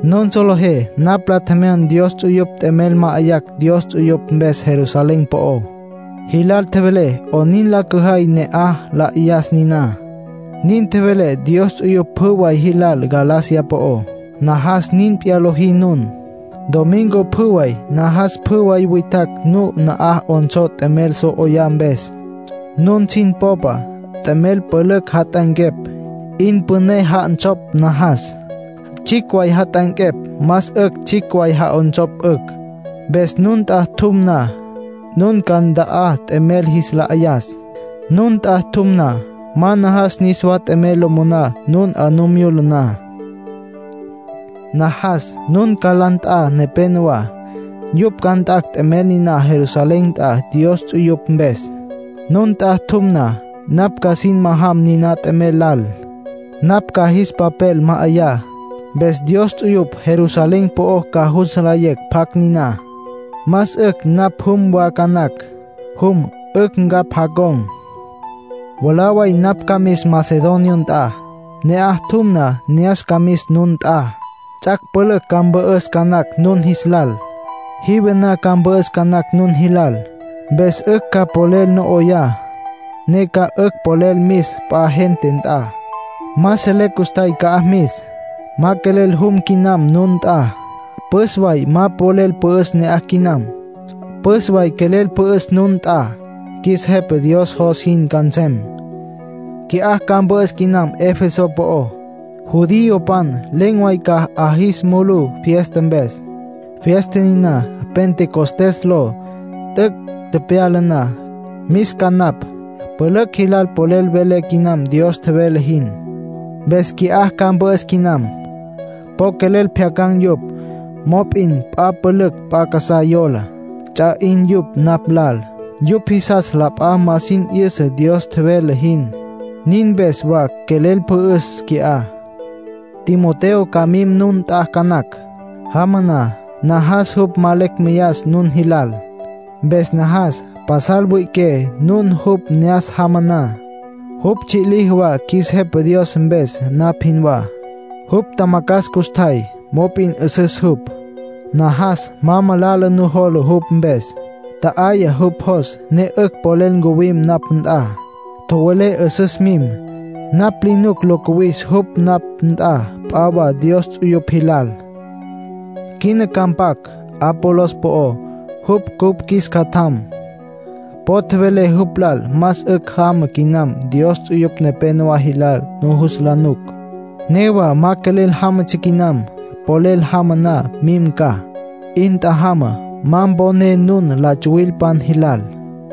Nun solejé napj la tjemyon Dios ts'uyupj t'emel ma'ayacj Dios ts'uyupj mpes Jerusalén po'ó. Jilal tjevelé 'onin la cüjay ne la 'ayas niná. Nin tjevelé Dios ts'uyupj pjü way jilal Galacia po'ó. Najas nin p'iyá lojí nun. Domingo pjü way najas pjü way witjacj nun na'aj 'onsó t'emel so 'oyá mpes. Nun sin popa t'emel pülücj jat'anquepj, 'in püné ja'onsopj najas. Tsjicj way jat'anquepj, más tsjicj way ja'onsopj 'ücj. Mpes nun nt'a tjum na, nun ca nta'á t'emel jis la 'ayas. Nun nt'a tjum na, ma najas niswa t'emel lo moná nun 'a nu myula na. Najas nun ca la nt'a nepenowá, yupj ca nt'acj t'emel niná Jerusalén nt'a Dios ts'uyupj mpes. Nun nt'a tjum na, napj ca sin majam niná t'emel lal. Napj ca jis papel ma'ayá, mpes Dios ts'uyupj Jerusalén po'o ca jus nlayecj pjacj niná. Más 'ücj napj jum wa ca nacj. Jum, 'ücj ncapj jacon̈. Mwalá way napj ca mis Macedonia nt'a. Ne'aj tjum na, ne'as ca mis nun nt'a. Ts'ac' pülücj ca mpü'üs ca nacj nun jis lal. Jive na ca mpü'üs ca nacj nun jilal. Mpes 'ücj ca polel no 'oyá, ne ca 'ücj polel mis p'a gente nt'a. Ma selé custjay ca'aj mis. Ma quelel jum quinam nun nt'a; püs way ma polel pü'üs ne'aj quinam. Püs way quelel pü'üs nun nt'a. Qjuis Jepa Dios jos jin ca nsem. Qui'á ca mpü'üs quinam Efeso po'ó. Judiopan len̈ way ca 'a jis mulus fiesta mpes, fiesta niná Pentecostés ló. T'üc' tepyala na, mis ca napj. Pülücj jilal polel velé quinam Dios tjevele jin, mpes qui'á ca mpü'üs quinam. Po quelel pjyacan̈ yupj. Mop'in la p'a pülücj p'a casá yola. Ts'a 'in yupj napj lal. Yupj jisas la p'a ma sin 'yüsa Dios tjevele jin, nin mpes wa quelel pü'üs qui'á. Timoteo ca mim nun nt'a ca nacj. Jama na, najas jupj ma lecj meyas nun jilal. Mpes najas pasal wüi'iqué nun jupj ne'as jama na. Jupj tsji' liji wa qjuis Jepa Dios mpes, napj jinwá. Jupj tjamacjas custjay, mop'in 'üsüs jupj; najas ma malala nujola jupj mpes. Tja'ayá jupj jos, ne 'ücj polel ncuwim napj nt'a. Tjowelé 'üsüs mim. Napj li nuc lo cuwis jupj napj nt'a p'a wa Dios ts'uyupj jilal. Quina ca mpac Apolos po'ó, jupj cupj qjuis catjam. Po tjevelé jupj lal más 'ücj jama quinam Dios ts'uyupj nepénowa jilal nujus la nuc. Newa ma quelel jámatsja quinam. Polel jama na, mim ca. 'In tjajama ma poné nun la tsuwilpan jilal.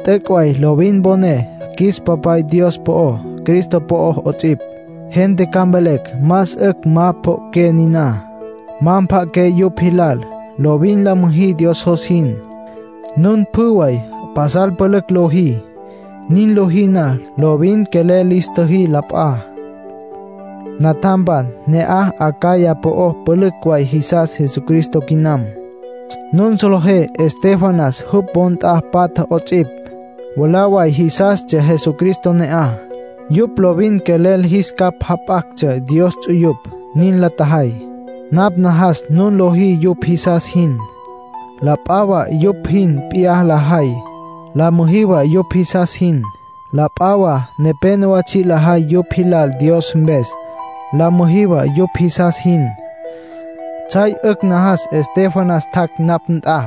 T'üc' way lovin mponé qjuis Papay Dios po'ó, Cristo po'ó 'ots'ipj. Gente ca mvelecj más 'ücj ma pjo'oqué niná. Ma mpja'aqué yupj jilal. Lovin la müjí Dios jos jin. Nun pjü way pasal pülücj lojí. Nin lojí na, lovin quelel lis tjüjí la p'a. Natjampan, ne'aj Acaya po'ó pülücj way jisas Jesucristo quinam. Nun solejé Estéfanas, jupj wo nt'a patja 'ots'ipj, mwalá way jisastsja Jesucristo ne'aj. Yupj lovin quelel jis capj jap'actsja Dios ts'uyupj. Nin la tjajay. Napj najas nun lojí yupj jisas jin. La p'a wa yupj jin p'iyá lajay, la müjí wa yupj jisas jin. La p'a wa nepénowa tsji' lajay yupj jilal Dios mpes. La müjí wa yupj jisas jin. Tsjay 'ücj najas Estéfanas tjac' napj nt'a.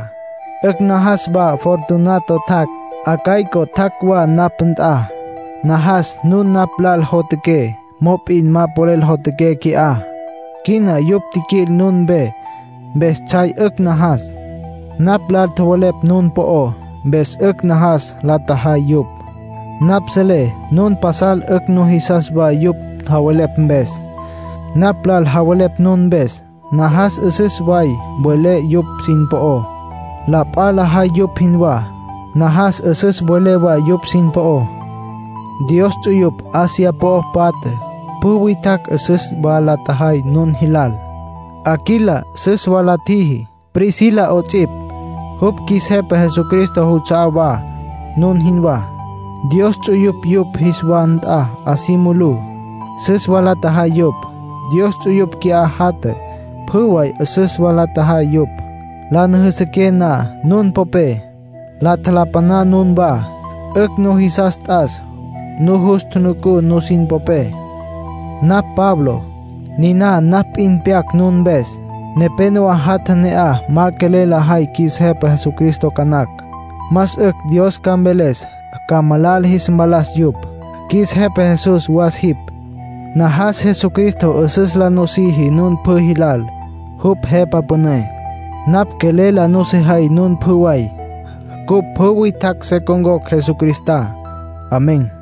'Ücj najas wa Fortunato tjac', Acaico tjac' wa, napj nt'a. Najas nun napj lal jotjaqué mop'in ma polel jotjaqué qui'á. Quina yupj tjiquil nun mpe, mpes tsjay 'ücj najas. Napj lal tjowelepj nun po'ó, mpes 'ücj najas la tjajay yupj. Napj selé nun pasal 'ücj jisas wa yupj javelepj mpes. Napj lal javelepj nun mpes. Najas 'üsüs way welé nun yupj sin po'ó. La p'a lajay yupj jinwá. Najas 'üsüs welé wa yupj sin po'ó. Dios ts'uyupj Asia po'o patja pjü witjacj süs wa la tjajay nun jilal. Aquila süs wa la tjiji, Priscila 'ots'ipj; yupj qjuis Jepa Jesucristo juts'a'á wa, nun jinwá. Dios ts'uyupj yupj jis wa nt'a 'a si mulú, süs wa la tjajay yupj. Dios ts'uyupj qui'á jatja, pjü way süs wa la tjajay yupj. La nüjüsüqué na nun popé, la tjalapaná nunwá. 'Ücj nujisas t'as nujus tjunucú nusin popé. Napj Pablo. Niná napj p'in pyac nun mpes. Nepénowa jatja ne'aj ma quelel lajay qjuis Jepa Jesucristo ca nacj. Más 'ücj Dios ca mveles ca malala jis mpalas yupj. ¡Qjuis Jepa Jesús, was jipj! Najas Jesucristo 'üsüs la nusiji nun pjü jilal, jupj Jepa Püné. Napj quelel la nusejay nun pjü way. Cupj pjü witjacj se con̈cocj Jesucristá. Amén.